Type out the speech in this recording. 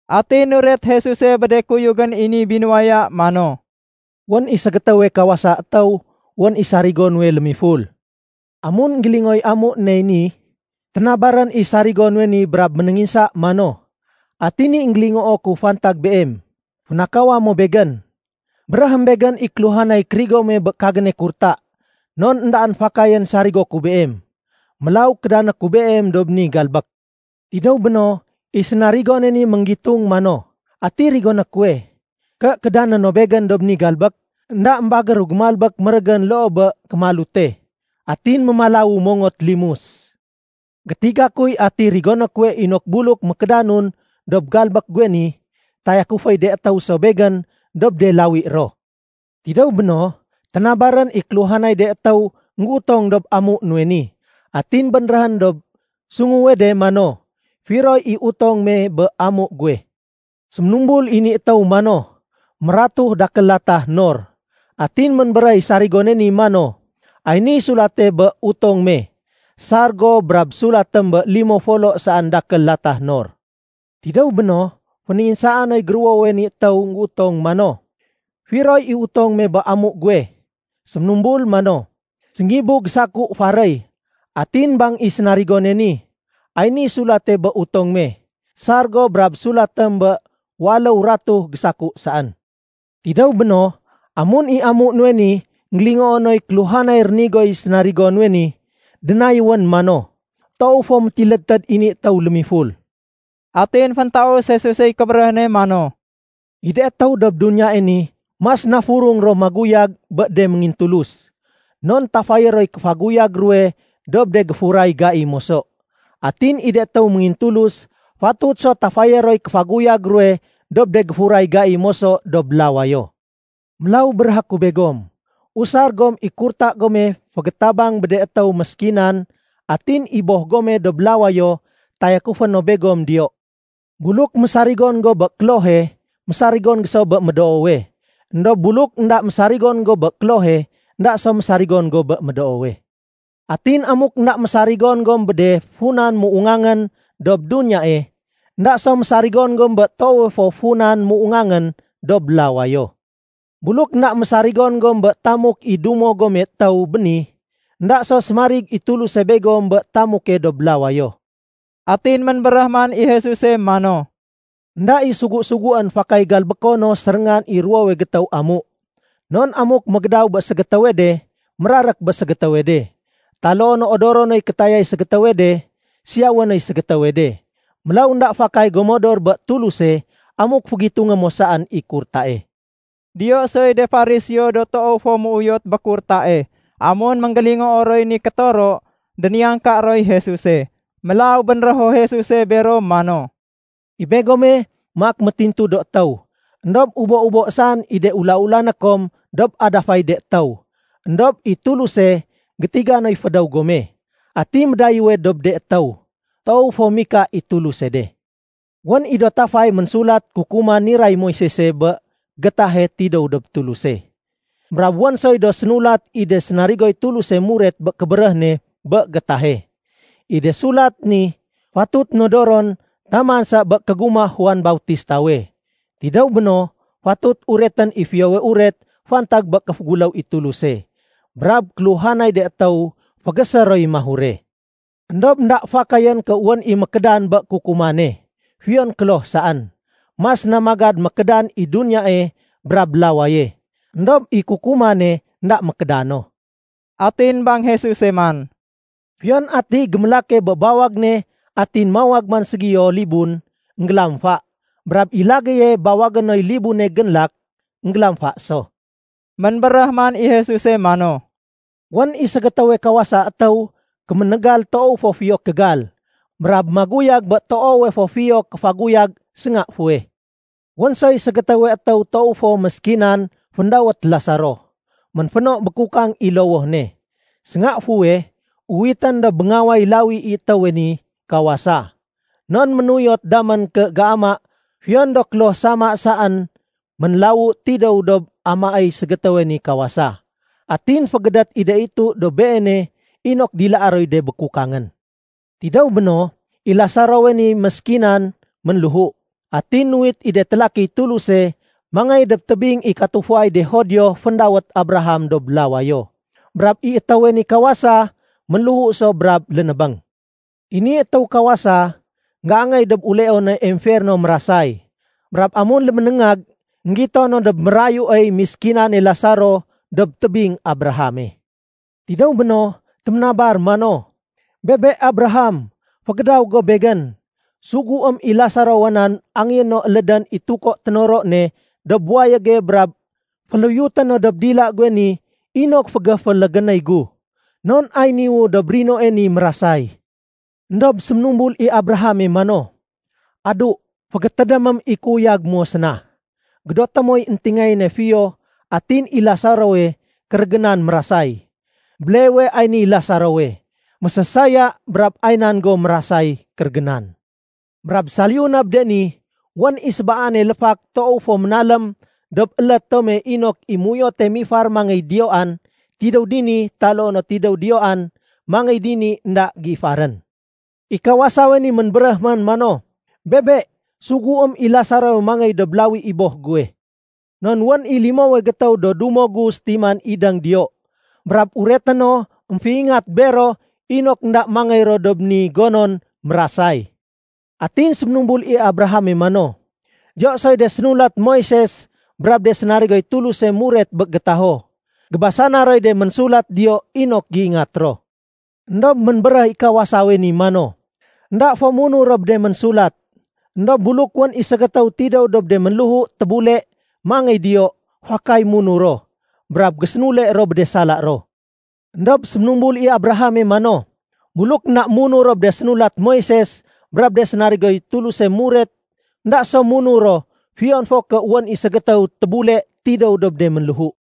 Atin nuret Jesuse bé de kuyugén i ni binuwaya mano, “Wén i ségétéwe kawasa étéw, wén i sénarigo nuwe lémiful. Amun énggélingooy amu nuwey ni, ténabarén i sénarigo nuwe ni brab ménénginsa mano, ‘Ati ni énggélingoo ku fantag beem? Fénakawa mo begén? Béréhém begén i kéluhanay kérigo muwe bé kagéne kurta. Non éndaén fakayén sarigo ku beem. Mélaw kédané ku beem dob ni galbék.’ Tidéw béno, i sénarigone ni ménggitung mano, ‘Ati rigoné kuwe, ké kédané no begén dob ni galbék? Enda émbagéru gémalbék mérégén loo bé kémalute. Atin mémalawu mongot limus. Gétiga kuy ati rigoné kuwe inok buluk mékédanun dob galbék guwe ni, tayakuféy de étéw so begén dob de lawi ro.’ Tidéw béno, ténabarén i kéluhanay de étéw énggéutong dob amu nuwe ni. Atin bénréhén dob sunguwe de mano, ‘Firoy i utong me bé amu guwe?’ Séménumbul i ni étéw mano, ‘Mératu dakél latah nor.’ Atin ménbéréh i sénarigone ni mano, ‘Ay ni sulate bé utong me. Sar go brab sulatém bé limo folo saén dakél latah nor.’ Tidéw béno, fénénginsaa noy géruwowe ni étéw énggéutong mano, ‘Firoy i utong me bé amu guwe?’ Séménumbul mano, ‘Séngibu gésaku faréy.’ Atin bang i sénarigone ni, ‘Ay ni sulate bé utong me. Sar go brab sulatém bé waléw ratu gésaku saén.’ Tidéw béno, amun i amu nuwe ni énggélingoo noy kéluhanay rénigoy sénarigo nuwe ni, dénayéwén mano, ‘Toow fo métilédtéd i ni étéw lémiful.’” Atin féntaus Jesusey kébéréh ne mano, “I de étéw dob duniyae ni mas na furung ro maguyag bé de méngintulus. Non tafayé roy kéfaguyag ruwe dob de géfuray gai moso. Atin i de étéw méngintulus fatut so tafayé roy kéfaguyag ruwe dob de géfuray gai moso dob lawayo. “Mélaw béréhé ku begom, usar gom i kurta gome fégétabang bé de étéw méskinan. Atin i Boh gome dob lawayo tayakufé no begom diyo. Buluk mésarigon go bé klohe, mésarigon go so bé médoowe. Endob buluk énda mésarigon go bé klohe, énda so mésarigon go bé médoowe. Atin amuk énda mésarigon gom bé de funan méungangén dob duniyae, énda so mésarigon gom bé toowe fo funan méungangén dob lawayo. Buluk énda mésarigon gom bé tamuk i dumo gome étéw béni, énda so sémarig i Tuluse begom bé tamuke dob lawayo.” Atin ménbéréh man i Jesuse mano, “Enda i sugu-suguén fakay galbéko no séréngan i ruwowe gétéw amu. Non amuk mégédaw bé ségétéwe de, mérarék bé ségétéwe de. Taloo no odoro noy kétayay ségétéwe de, siyawé noy ségétéwe de. Mélaw énda fakay go modor bé Tuluse amuk fégitungé mo saén i kurtae.” Diyo soy de Fariseo do toow fo méuyot bé kurtae. Amun énggélingoo roy ni kétoro, déniyangka roy Jesuse. Mélaw bénrého Jesuse bero mano, “I begome maak métintu do étéw, éndob ubo-ubo saén i de ula-ulané kom dob adafay de étéw. Endob i Tuluse gétiga noy fédéw gome. Ati médayéwe dob de étéw, toow fo mika i Tuluse de. “Wén i do tafay ménsulat kukuman niray Moisese bé gétahe tidéw dob Tuluse, brab wén soy do sénulat i de sénarigoy Tuluse muret bé kébéréh ne bé gétahe. I de sulat ni fatut nodoron taman sa bé kégumah Juan Bautistawe. Tidéw béno, fatut uretén i Fiyowe Uret fantag bé kéféguléw i Tuluse. Brab kéluhanay de étéw fégésé roy mahure. Endob énda fakayén ké wén i mékédan bé kukumane, fiyon kloh saén. Mas na magad mékédan i duniyae brab lawaye, éndob i kukumane énda mékéda no.” Atin bang Jesuse man, “Fiyon atiy gémélake bé bawag ne atin mawag man ségiyo libun, énggélamfa. Brab i lagéye bawagé noy libune génlak, énggélamfa so.” Ménbéréh man i Jesuse mano, “Wén i ségétéwe kawasa étéw kéménégal toow fo fiyo kégal, brab maguyag bé toowe fo fiyo kéfaguyag sénga fuweh. Wén soy ségétéwe étéw toow fo méskinan féndawét Lasaro. Ménféno békukang i lowoh ne. Sénga fuweh uwitén dob béngaway lawi i étéwe ni kawasa, non ménuyot damén ké géama fiyon do kloh sama saén ménlawu tidéw dob amaéy ségétéwe ni kawasa. Atin fégédét i de itu dob beene inok dilaé roy de békukangén. Tidéw béno, i Lasarowe ni méskinan ménléhu. Atin nuwit i de télakiy Tuluse mangéy dob tébing i katufuay de Judio féndawét Abraham dob lawayo. Brab i étéwe ni kawasa ménléhu so brab lénébéng. I ni étéw kawasa, énggéangéy dob uleone emferno mérasay. Brab amun léménéngag, énggito no dob mérayuey miskinane Lasaro dob tébing Abrahame. Tidéw béno, téménabar mano, ‘Bebe Abraham, fégédaw go begén. Suguém i Lasarowa nan angéyé no élédén i tuko ténoro ne dob wayége brab féluyuté no dob dila guwe ni inok fégéfélégénéy gu. Non ay niwu dob rinoe ni mérasay.’ Endob séménumbul i Abrahame mano, ‘Adu, fégétédémém i kéuyag mo séna, gédoté moy éntingayéne fiyo atin i Lasarowe kérégénan mérasay. Béleewe ay niy Lasarowe mésésaya brab ay nan go mérasay kérégénan. Brab saliyu na bé de ni, wén i sébaane léfak toow fo ménalém dob élét tome inok i méuyote mifar mangéy diyoan tidéw dini taloo no tidéw diyoan mangéy dini énda géifarén.’ I kawasawe ni ménbéréh man mano, ‘Bebe, suguém i Lasarowe mangéy dob lawi i boh guwe. Non wén i limowe gétéw do dumo gu sétiman idéng diyo. Brab ureté no émféingat bero inok énda mangéy ro dob ni gonon mérasay.’ Atin séménumbul i Abrahame mano, ‘Diyo soy de sénulat Moises brab de sénarigoy Tuluse muret bé gétaho. Gébasana roy de ménsulat diyo inok géingat ro.’ Endob ménbéréh i kawasawe ni mano, ‘Enda fo munur ro bé de ménsulat. Endob buluk wén i ségétéw tidéw dob de ménléhu tébule mangéy diyo, fakay munur ro, brab gésénule ro bé de sala ro.’ Endob séménumbul i Abrahame mano, ‘Buluk énda munur ro bé de sénulat Moises brab de sénarigoy Tuluse muret, énda so munur ro fiyon fo ké wén i ségétéw tébule tidéw dob de ménléhu.’”